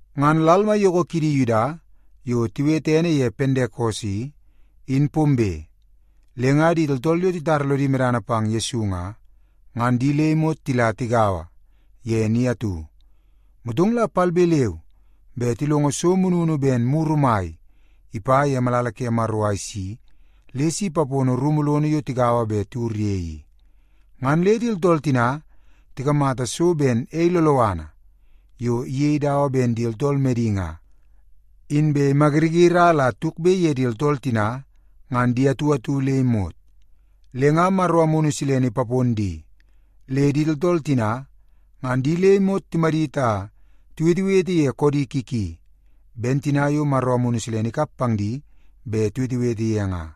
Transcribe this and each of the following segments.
Ngan lal maiyoko kidi Yuda yo tiwete ene ye Pentekos i, in pombe. Le nga di tooltool yo titara lodi medana pang Yesu nga, ngan di le imot tila tigaua ye ni atu. Motong la palbe leu be tilongo so mununu ben muru mai ipa ye malala ke Maro a isi le si ipapono rumu lono yo tigaua inbe tiwur ye i. Ngan le di tooltool tina tikamata so ben ei loloana yo iyei dawa ben di tooltool medi nga, inbe imayiriyiri a la tukbe ye di tooltool tina ngan di atu atu le imot. Le nga Maro Amunu Silene ipapon di, le di tooltool tina ngan di le imot timadit a tiwetewete ye koodi ki ki, ben tina yo Maro Amunu Silene ikap pang di bet tiwetewete ye nga.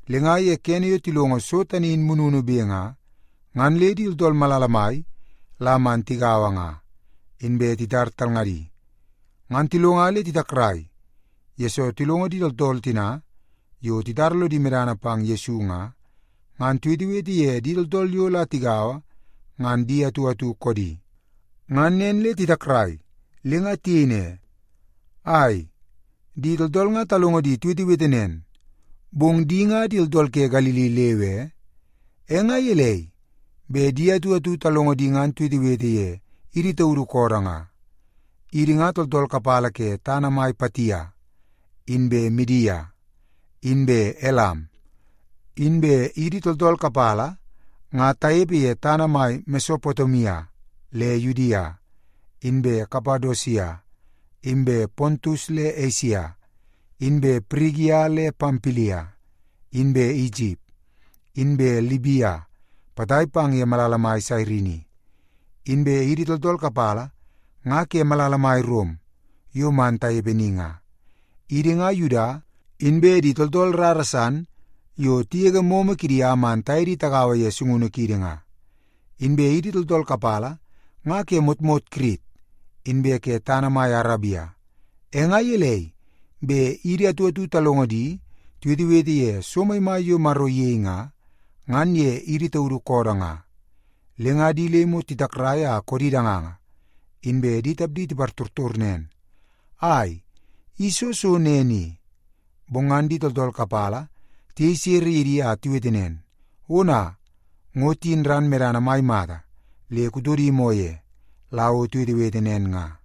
Le nga ye kene yo tilongo so tani in mununube nga, ngan le di tooltool malala mai la man tigaua nga. Inbe titar talngadi, ngan tilonga le titakrai, yesoo tilongo di tooltool tina yo titara lodi medana pang Yesu nga, ngan tiwetewete ye di tooltool yo la tigaua ngan di atu atu koodi. Ngan nen le titakrai, le nga tiyei ne, “Ai, di tooltool nga talongo di tiwetewete nen, bong di nga di tooltool ke Galili leu e? E nga gelei bet idi atu atu talongo di ngan tiwetewete ye idi taudu koodoo nga? Idi nga tooltool kapala ke tana mai Patia, inbe Midia, inbe Elam. Inbe idi tooltool kapala nga tanepe ye tana mai Mesopotemia le Yudia, inbe Kapadosia, inbe Pontus le Esia, inbe Pirigia le Pampilia, inbe Isip, inbe Libia potai pang ye malala mai Sairini. Inbe idi tooltool kapala nga ke malala mai Rom yo man tanepe ni nga. Idi nga Yuda, inbe di tooltool rara san yo tigege momo kidi a man taye di tagaua ye sungunu kiidi nga. Inbe idi tooltool kapala nga ke motmot Kirit inbe ke tana mai Arabia. E nga gelei bet idi atu atu talongo di tiwetewete ye so maimai yo Maro iyei nga, ngan ye idi taudu koodoo nga?” Le nga di le imot titakrai a koodi danganga, inbe di tapdi tipartortor nen, “Ai, i soo so nen i?” Bong ngan di tooltool kapala tiyei sere ye di a tiwete nen, “Ona, ngo tiyin ran medana mai mata le kutodi moo ye la o tiwetewete nen nga.”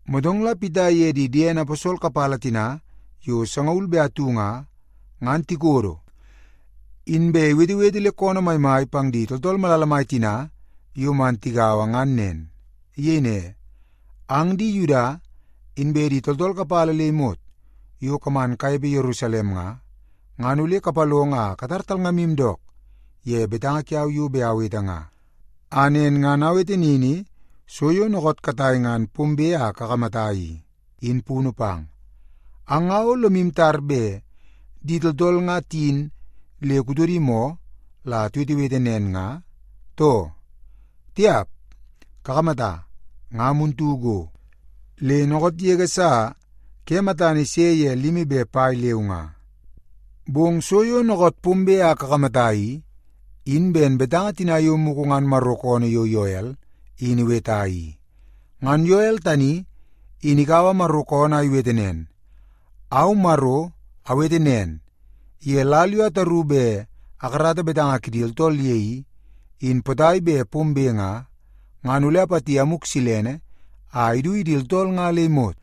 Motong la Pita iye di diene aposol kapala tina yo sangaul be atu nga, ngan tikodo, inbe iwetewete le koonoo maimai pang di tooltool malala mai tina yo man tigaua ngan nen. Iyei ne, “Ang di Yuda, inbe di tooltool kapala le imot yo kaman kanepe Yerusalem nga, ngan ole kapalongo a katar talngamu dook ye betanga kiau yo bet awete nga, a nen ngan awete nini so yo dookoot katai ngan pombe a kakamata i, in punu pang. Ang nga o lomu tar bet di tooltool nga tiyin le kutodi moo la tiwetewete nen nga, too? Tiap, kakamata, nga muntu go, le dookoot yege sa ke matana ise ye limi be pai leu nga. Bong so yo dookoot pombe a kakamata i, in ben betanga tina yo mugu ngan Maro koonoo yo Yoel in iweta i. Ngan Yoel tani in ikaua Maro koonoo a iwete nen, ‘Au, Maro, awete nen, ye lal yo ataru bet akarata betanga kidi tooltool ye i, in potai bet pombe nga, ngan ole apati Amuk Silene a idu ye di tooltool nga le imot.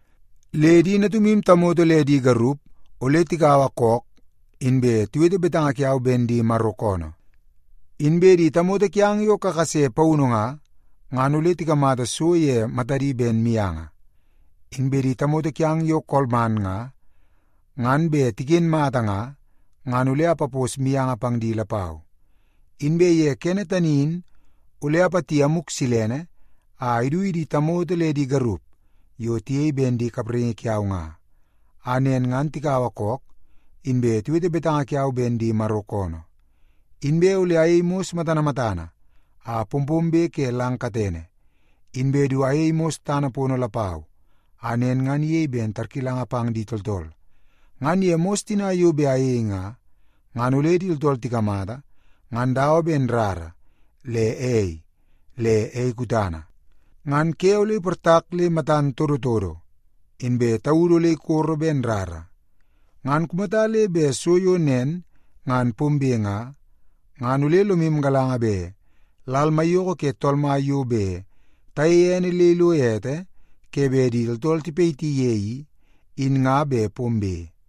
Le di natumu tamoto le di garup ole tikaua kook inbe tiwete betanga kiau ben di Maro koonoo. Inbe di tamoto kiang yo kakase paunu nga, ngan ole tikamata so ye matadi ben mianga. Inbe di tamoto kiang yo kolman nga, ngan bet tiken mata nga, ngan ole apapos mianga pang di lapau. Inbe ye kene tani in, ole apati Amuk Silene a idu ye di tamoto le di garup yo tiyei ben di kapraingi kiau nga, a nen ngan tikaua kook, inbe tiwete betanga kiau ben di Maro koonoo. Inbe ole ayei mos matana matana a pompombe ke lang katene, inbe du ayei mos tana lapau a nen ngan iyei ben tarkilanga pang di tooltool. Ngan ye mos tina yo bet ayei nga, ngan ole di tooltool tikamata ngan dawa ben rara, le ei, le ei kutana. Ngan ke ole iportak le matan todotodo, inbe taudu ole ikoro ben rara. Ngan kumata le bet so yo nen ngan pombe nga, ngan ole lomu galanga bet lal maiyoko ke Tool Mai yo bet tayeie ene le ilo ete ke bet di tooltool tipayiti ye i, in nga bet pombe.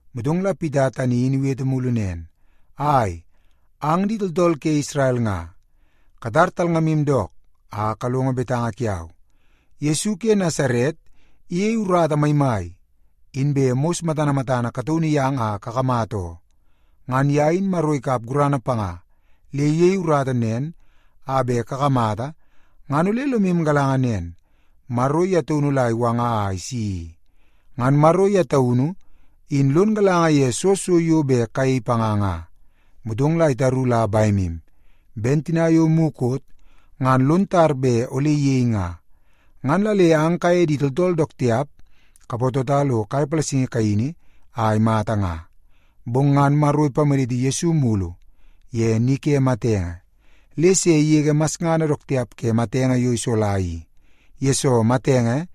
Motong la Pita tani in iwete mulu nen, “Ai, ang di tooltool ke Isrel nga, katar talngamu dook a kalongo betanga kiau. Yesu ke Nasaret iyei urata maimai inbe mos matana matana kataunu yang a kakamata oo. Ngan ye in Maro ikap gurana panga le iyei urata nen a bet kakamata ngan ole lomu galanga nen, Maro ye taunu la iwanga a isi i. Ngan Maro ye taunu in lon galanga ye soo so yo bet kayei panga nga, motong la itaru la bemu, ben tina yo mukot ngan lon tar bet ole iyei nga. Ngan la le ang kaye di tooltool dook tiap kapatota lo kai palasingi kaini a imata nga. Bong ngan Maro ipamaditi Yesu mulu ye ni ke matenge, le se igege masngana dook tiap ke matenge yo isola i, yesoo matenge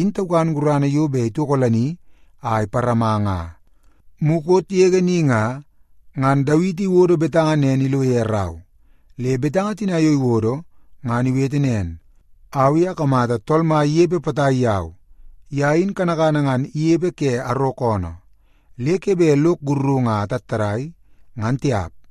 in taukan gurana yo bet itokolani a iparama nga. Mukot yege ni nga, ngan Dawiti iwodo betanga nen ilo ye rau. Le betanga tina yo iwodo ngan iwete nen, ‘Au i akamata Tool Mai inepe potai yau. Ye in kanakana ngan inepe ke arok oonoo, le ke bet lok sakarungu a atattadai, ngan tiap.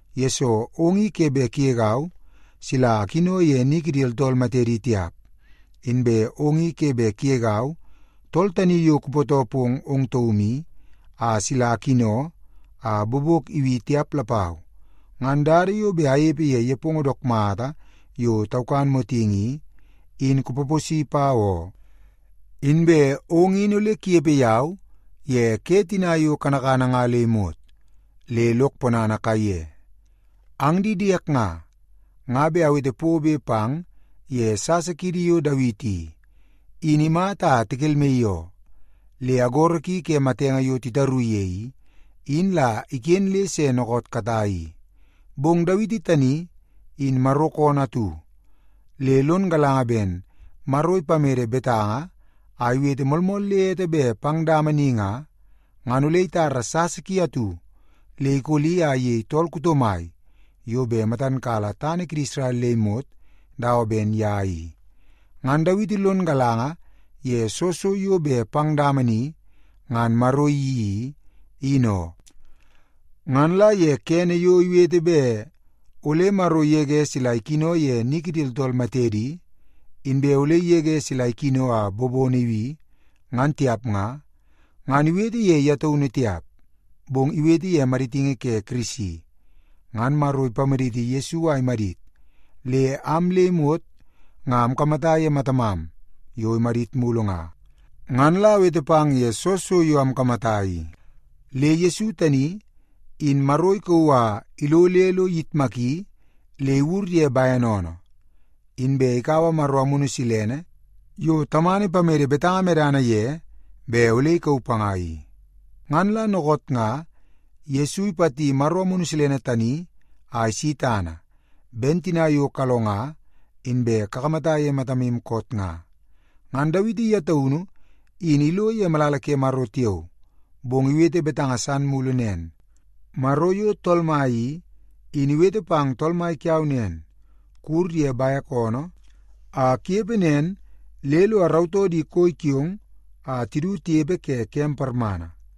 yesoo ong i ke bet kugegau sila akino ye ni kidi tooltool matedi tiap. Inbe ong i ke bet kugegau, Tool Tani Yo Kupootoo Pong Ong Taum I, a sila akino a bobok ibi tiap lapau. Ngan dada yo bet anepe ye nepongo dook mata yo taukan motingi i, in kupaposi pau oo. Inbe ong in ole kunepe yau ye ke tina yo kanakana nga le imot, le lok ponana kaiye.’ “Ang di diek nga, nga bet awete pobe pang ye sasa kiidi yo Dawiti i, in imata a tikelmaii oo. Le agoro ki ke matenge yo titaru ye i, in la iken le se dookoot katai i. Bong Dawiti tani in Maro koonoo atu, le lon galanga ben Maro ipamede betanga a iwete moolmool le ete bet pang dama ni nga, ngan ole itara sasa ki atu le ikoli a iyei tool kuto mai yo bet matan kala tana kidi Isrel le imot dawa ben ye i. Ngan Dawiti lon galanga ye soo so yo bet pang dama ni ngan Maro iyeii i, in oo. Ngan la ye kene yo iwete bet ole Maro igege sila ikino ye ni kidi tooltool matedi, inbe ole igege sila ikino a bobono ibi, ngan tiap nga, ngan iwete ye ye taunu tiap, bong iwete ye maditingi ke Kirisi. Ngan Maro ipamaditi Yesu a imadit, le am le imot nga amkamata ye matamam yo imadit mulu nga, ngan la awete pang ye soo so yo amkamata i. Le Yesu tani, in Maro ikauu a ilo le lo iyitmaki le iwur ye bene oonoo. Inbe ikaua Maro Amunu Silene yo Tamana ipamede betanga medana ye bet ole ikauu panga i. Ngan la dookoot nga Yesu ipati Maro Amunu Silene tani a isi tana, ben tina yo kalonga inbe kakamata ye matamu koot nga. Ngan Dawiti ye taunu in ilo ye malala ke Maro tiao, bong iwete betanga san mulu nen. ‘Maro yo Tool Mai i, in iwete pang Tool Mai kiau nen, “Kuwur ye bek oonoo a kunepe nen le lo arautoo di koi kiong a tidu tinepe ke kem parmana.” ’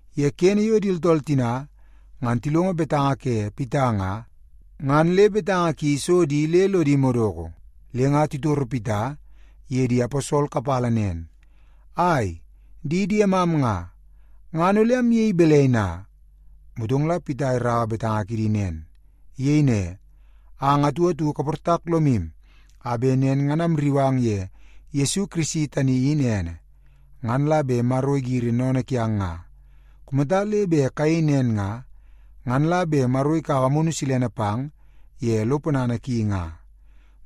Ye kene yo di tooltool tina ngan tilongo betanga ke Pita nga, ngan le betanga ki iso di le lodi madoko. Le nga titoro Pita iye di aposol kapala nen, “Ai, di diemam nga, ngan ole amyei balai na?” Motong la Pita iraua betanga kidi nen. Iyei ne, “Ang atu atu kaportak lomu a bet nen ngan amrriu ang ye Yesu Kirisi tani in ene, ngan la bet Maro igiri sennene kiang nga. Kumata le bet kayei nen nga, ngan la bet Maro ikaua Amunu Silene pang ye lo ponana ki nga.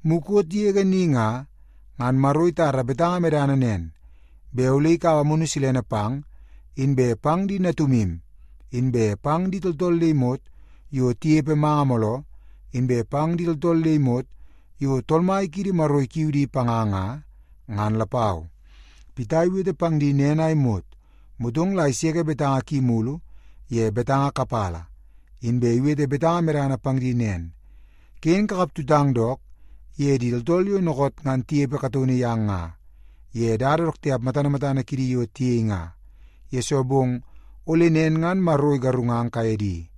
Mukot yege ni nga, ngan Maro itara betanga medana nen, bet ole ikaua Amunu Silene pang, inbe pang di natumu, inbe pang di tooltool le imot yo tinepe manga mooloo, inbe pang di tooltool le imot yo Tool Mai kiidi Maro ikiu di panga nga, ngan lapau.” Pita iwete pang di nen a imot, motong la iseke betanga ki mulu ye betanga kapala, inbe iwete betanga medana pang di nen, “Ken kakap tutang dook ye di tooltool yo dookoot ngan tinepe kataunu yang nga, ye dada dook tiap matana matana kidi yo tiyei nga, yesoo bong ole nen ngan Maro igarungang kaye di.”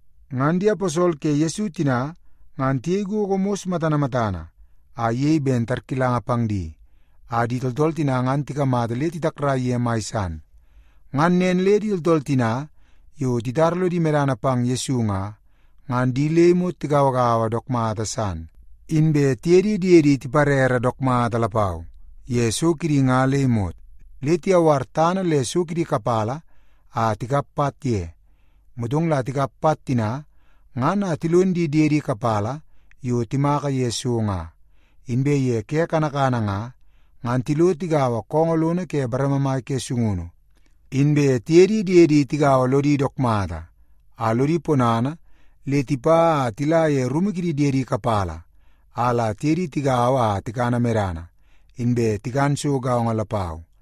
Ngan di aposol ke Yesu tina ngan tiyei gogo mos matana matana a iyei ben tarkilanga pang di, a di tooltool tina ngan tikamata le titakrai ye mai san. Ngan nen le di tooltool tina yo titara lodi medana pang Yesu nga, ngan di le imot tigauagaua dook mata san, inbe tiye di diedi tiparere dook mata lapau ye so kidi nga le imot. Le tiyawar tana le so kidi kapala a tikap pat ye, motong la tikap pat tina ngan a tilon di diede kapala yo timaka ye so nga. Inbe ye ke kanakana nga, ngan tilo tigaua koongoo lono ke bareme mai ke sungunu. Inbe tiye di diedi tigaua lodi dook mata a lodi ponana le tipa a tila ye rumu kidi diedi kapala a la tiye di tigaua a tikana medana, inbe tikan so gaongo lapau.